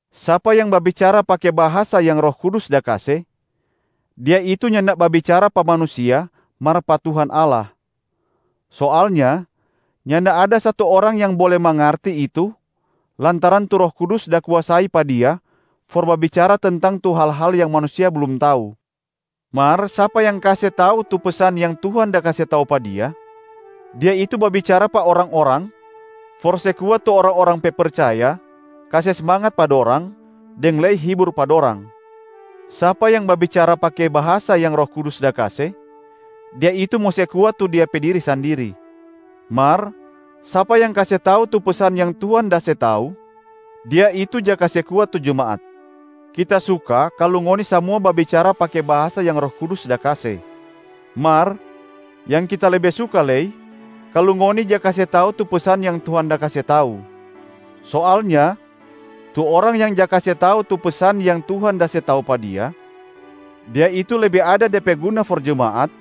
Sapa yang babicara pake bahasa yang Roh Kudus da kase, dia itu nyanda babicara pa manusia mar pa Tuhan Allah. Soalnya nyanda ada satu orang yang bole mangarti itu lantaran tu Roh Kudus da kuasai pa dia for babicara tentang tu hal-hal yang manusia blum tau. Mar sapa yang kase tau tu pesan yang Tuhan da se tau pa dia, dia itu babicara pa orang-orang for se kuat tu orang-orang pe percaya, kase smangat pa dorang, deng lei hibur pa dorang. Sapa yang babicara pake bahasa yang Roh Kudus da kase, dia itu mo se kuat tu dia pe diri sandiri. Mar sapa yang kase tau tu pesan yang Tuhan da se tau, dia itu ja kase kuat tu jemaat. Kita suka kalu ngoni samua babicara pake bahasa yang Roh Kudus da kase, mar yang kita lebe suka lei kalu ngoni ja kase tau tu pesan yang Tuhan da kase tau. Soalnya tu orang yang ja kase tau tu pesan yang Tuhan da se tau pa dia, dia itu lebe ada de pe guna for jemaat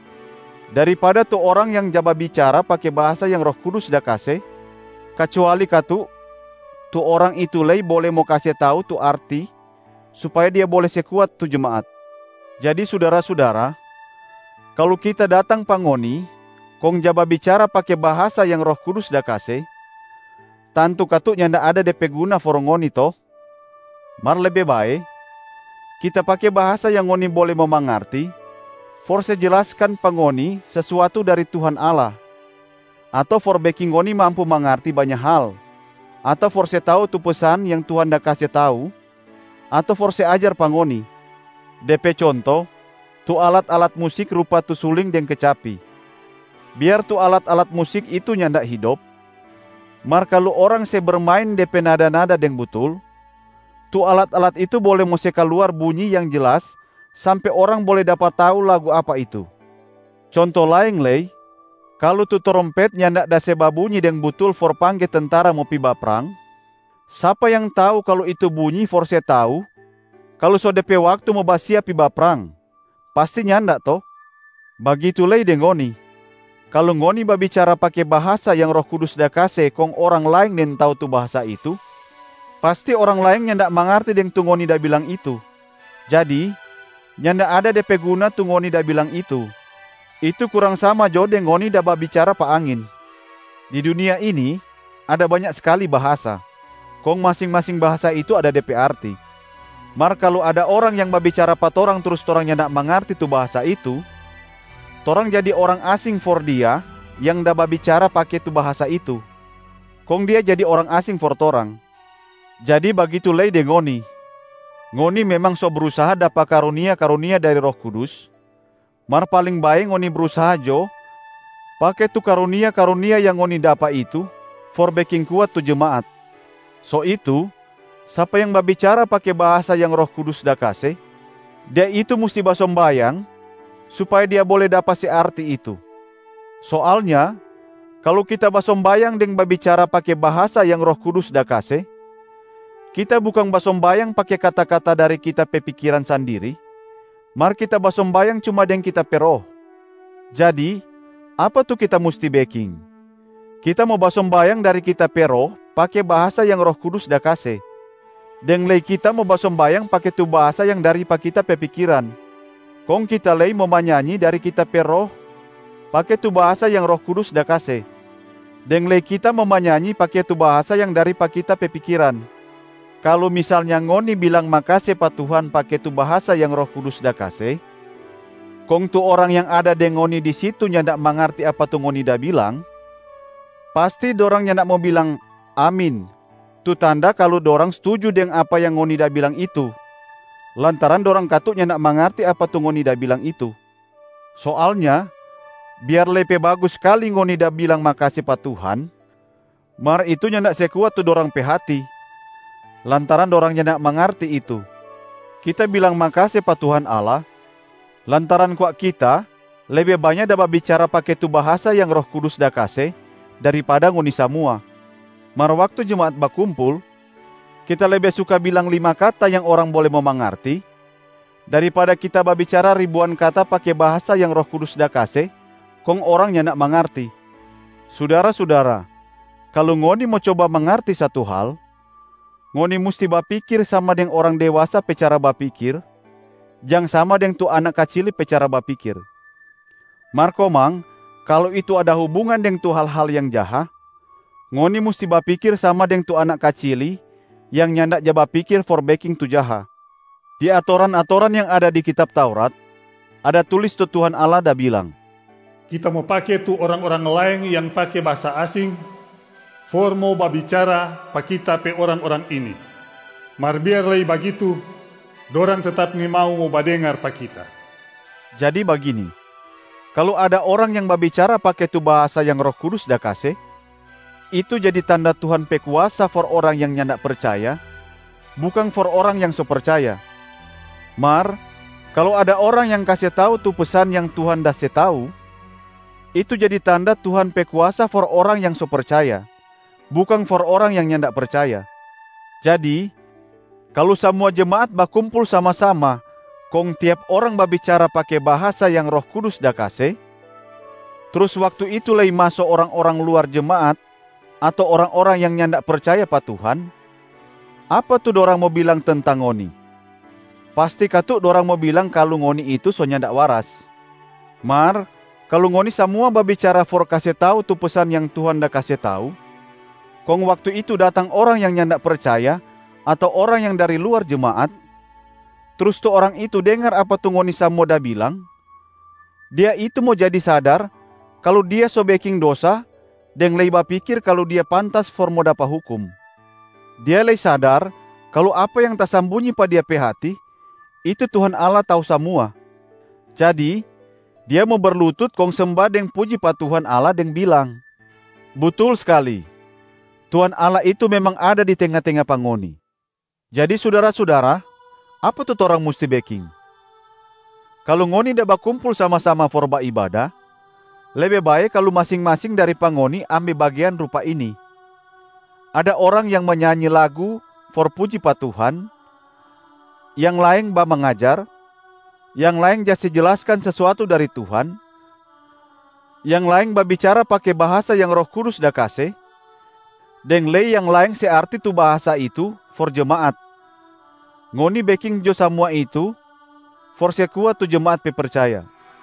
daripada tu orang yang ja babicara pake bahasa yang Roh Kudus da kase, kacuali katu tu orang itu lei bole mo kase tau tu arti supaya dia bole se kuat tu jemaat. Jadi sudara-sudara, kalu kita datang pa ngoni kong ja babicara pake bahasa yang Roh Kudus da kase, tantu katu nyanda ada de pe guna for ngoni to? Mar lebe bae, kita pake bahasa yang ngoni bole mo mangarti for se jelaskan pa ngoni sesuatu dari Tuhan Allah, ato for beking ngoni mampu mangarti banya hal, ato for se tau tu pesan yang Tuhan da kase tau, ato for se ajar pa ngoni. De pe conto: tu alat-alat musik rupa tu suling deng kecapi. Biar tu alat-alat musik itu nyanda hidop, mar kalu orang se bermain de pe nada-nada deng butul, tu alat-alat itu bole mo se kaluar bunyi yang jelas sampe orang bole dapa tau lagu apa itu. Conto laeng lei, kalu tu trompet nyanda da se babunyi deng butul for pangge tentara mo pi baprang, sapa yang tau kalu itu bunyi for se tau kalu so de pe waktu mo basiap pi baprang? Pasti nyanda to? Bagitu lei deng ngoni, kalu ngoni babicara pake bahasa yang Roh Kudus da kase kong orang laeng nintau tu bahasa itu, pasti orang laeng nyanda mangarti deng tu ngoni da bilang itu. Jadi nyanda ada de pe guna tu ngoni da bilang itu, itu kurang sama jo deng ngoni da babicara pa angin. Di dunia ini ada banya skali bahasa, kong masing-masing bahasa itu ada de pe arti. Mar kalu ada orang yang babicara pa torang trus torang nyanda mangarti tu bahasa itu, torang jadi orang asing for dia yang da babicara pake tu bahasa itu, kong dia jadi orang asing for torang. Jadi bagitu lei deng ngoni, ngoni memang so brusaha dapa karunia-karunia dari Roh Kudus, mar paling bae ngoni brusaha jo pake tu karunia-karunia yang ngoni dapa itu for beking kuat tu jemaat. So itu sapa yang babicara pake bahasa yang Roh Kudus da kase, dia itu musti basombayang supaya dia bole dapa se arti itu. Soalnya kalu kita basombayang deng babicara pake bahasa yang Roh Kudus da kase, kita bukang basombayang pake kata-kata dari kita pe pikiran sandiri mar kita basombayang cuma deng kita pe roh. Jadi apa tu kita musti beking? Kita mo basombayang dari kita pe roh pake bahasa yang Roh Kudus da kase, deng lei kita mo basombayang pake tu bahasa yang dari pa kita pe pikiran. Kong kita lei mo manyanyi dari kita pe roh pake tu bahasa yang Roh Kudus da kase, deng lei kita mo manyanyi pake tu bahasa yang dari pa kita pe pikiran. Kalu misalnya ngoni bilang makase pa Tuhan pake tu bahasa yang Roh Kudus da kase, kong tu orang yang ada deng ngoni di situ nyanda mangarti apa tu ngoni da bilang, pasti dorang nyanda mo bilang, “Amin” tu tanda kalu dorang stuju deng apa yang ngoni da bilang itu, lantaran dorang katu nyanda mangarti apa tu ngoni da bilang itu. Soalnya biar lei pe bagus skali ngoni da bilang makase pa Tuhan, mar itu nyanda se kuat tu dorang pe hati lantaran dorang nyanda mangarti itu. Kita bilang makase pa Tuhan Allah, lantaran kwa kita lebe banya da babicara pake tu bahasa yang Roh Kudus da kase daripada ngoni samua. Mar waktu jemaat bakumpul, kita lebe suka bilang lima kata yang orang bole mo mangarti, daripada kita babicara ribuan kata pake bahasa yang Roh Kudus da kase kong orang nyanda mangarti. Sudara-sudara, kalu ngoni mo coba mangarti satu hal, ngoni musti bapikir sama deng orang dewasa pe cara bapikir, jang sama deng tu anak kacili pe cara bapikir. Mar komang kalu itu ada hubungan deng tu hal-hal yang jaha, ngoni musti bapikir sama deng tu anak kacili yang nyanda ja bapikir for beking tu jaha. Di atoran-atoran yang ada di kitab Taurat, ada tulis tu Tuhan Allah da bilang, “Kita mo pake tu orang-orang laeng yang pake bahasa asing for mo babicara pa Kita pe orang-orang ini. Mar biar lei bagitu, dorang tetap nimau mo badengar pa Kita.” Jadi bagini: kalu ada orang yang babicara pake tu bahasa yang Roh Kudus da kase, itu jadi tanda Tuhan pe kuasa for orang yang nyanda percaya, bukang for orang yang so percaya. Mar kalu ada orang yang kase tau tu pesan yang Tuhan da se tau, itu jadi tanda Tuhan pe kuasa for orang yang so percaya, bukang for orang yang nyanda percaya. Jadi kalu samua jemaat bakumpul sama-sama kong tiap orang babicara pake bahasa yang Roh Kudus da kase, trus waktu itu lei maso orang-orang luar jemaat ato orang-orang yang nyanda percaya pa Tuhan, apa tu dorang mo bilang tentang ngoni? Pasti katu dorang mo bilang kalu ngoni itu so nyanda waras. Mar kalu ngoni samua babicara for kase tau tu pesan yang Tuhan da kase tau, kong waktu itu datang orang yang nyanda percaya ato orang yang dari luar jemaat, trus tu orang itu dengar apa tu ngoni samua da bilang, dia itu mo jadi sadar kalu dia so beking dosa deng lei bapikir kalu dia pantas for mo dapa hukum. Dia lei sadar kalu apa yang tasambunyi pa dia pe hati, itu Tuhan Allah tau samua. Jadi dia mo berlutut kong semba deng puji pa Tuhan Allah deng bilang, “Butul skali, Tuhan Allah itu memang ada di tenga-tenga pa ngoni.” Jadi sudara-sudara, apa tu torang musti beking? Kalu ngoni da bakumpul sama-sama for baibada, lebe bae kalu masing-masing dari pa ngoni ambe bagean rupa ini: ada orang yang manyanyi lagu for puji pa Tuhan, yang laeng bamangajar, yang laeng ja se jelaskan sesuatu dari Tuhan, yang laeng babicara pake bahasa yang Roh Kudus da kase, deng lei yang laeng se arti tu bahasa itu for jemaat. Ngoni beking jo samua itu for se kuat tu jemaat pe percaya.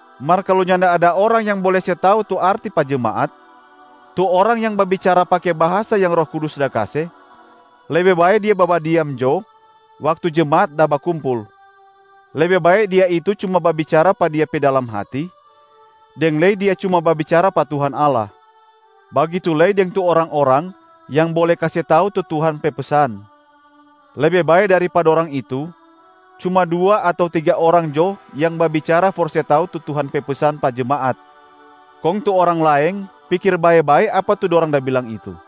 Mar kalu nyanda ada orang yang bole se tau tu arti pa jemaat, tu orang yang babicara pake bahasa yang Roh Kudus da kase, lebe bae dia babadiam jo waktu jemaat da bakumpul. Lebe bae dia itu cuma babicara pa dia pe dalam hati, deng lei dia cuma babicara pa Tuhan Allah. Bagitu lei deng tu orang-orang yang bole kase tau tu Tuhan pe pesan. Lebe bae dari pa dorang itu, cuma dua ato tiga orang jo yang babicara for se tau tu Tuhan pe pesan pa jemaat, kong tu orang laeng pikir bae-bae apa tu dorang da bilang itu.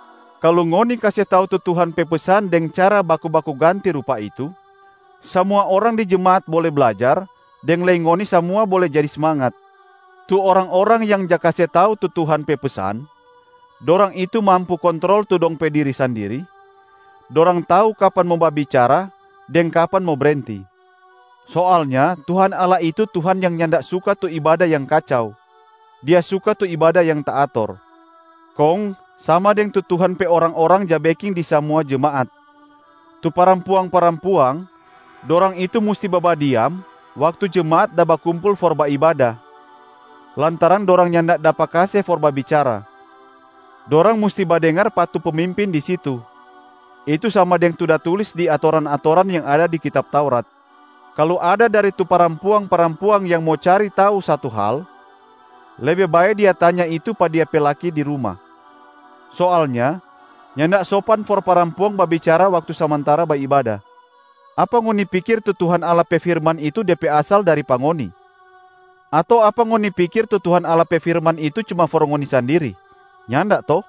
Kalu ngoni kase tau tu Tuhan pe pesan deng cara baku-baku ganti rupa itu, samua orang di jemaat bole blajar deng lei ngoni samua bole jadi smangat. Tu orang-orang yang ja kase tau tu Tuhan pe pesan, dorang itu mampu kontrol tu dong pe diri sandiri, dorang tau kapan mo babicara deng kapan mo brenti. Soalnya Tuhan Allah itu Tuhan yang nyanda suka tu ibada yang kacau, Dia suka tu ibada yang taator. Kong sama deng tu Tuhan pe orang-orang ja beking di samua jemaat, tu parampuang-parampuang, dorang itu musti babadiam waktu jemaat da bakumpul for baibada, lantaran dorang nyanda dapa kase for babicara. Dorang musti badengar pa tu pemimpin di situ, itu sama deng tu da tulis di atoran-atoran yang ada di kitab Taurat. Kalu ada dari tu parampuang-parampuang yang mo cari tau satu hal, lebe bae dia tanya itu pa dia pe laki di ruma. Soalnya nyanda sopan for parampuang babicara waktu samantara baibada. Apa ngoni pikir tu Tuhan Allah pe firman itu de pe asal dari pa ngoni? Ato apa ngoni pikir tu Tuhan Allah pe firman itu cuma for ngoni sandiri? Nyanda to?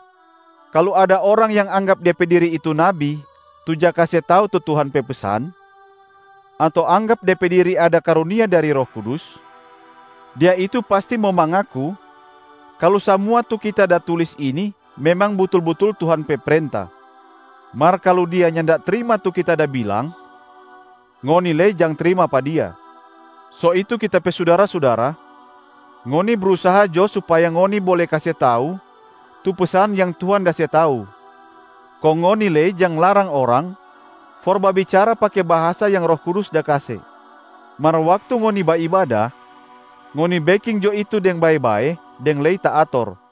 Kalu ada orang yang anggap de pe diri itu nabi tu ja kase tau tu Tuhan pe pesan, ato anggap de pe diri ada karunia dari Roh Kudus, dia itu pasti mo mangaku kalu samua tu kita da tulis ini memang butul-butul Tuhan pe prenta. Mar kalu dia nyanda trima tu kita da bilang, ngoni lei jang trima pa dia. So itu kita pe sudara-sudara, ngoni brusaha jo supaya ngoni bole kase tau tu pesan yang Tuhan da se tau, kong ngoni lei jang larang orang for babicara pake bahasa yang Roh Kudus da kase. Mar waktu ngoni baibada, ngoni beking jo itu deng bae-bae deng lei taator.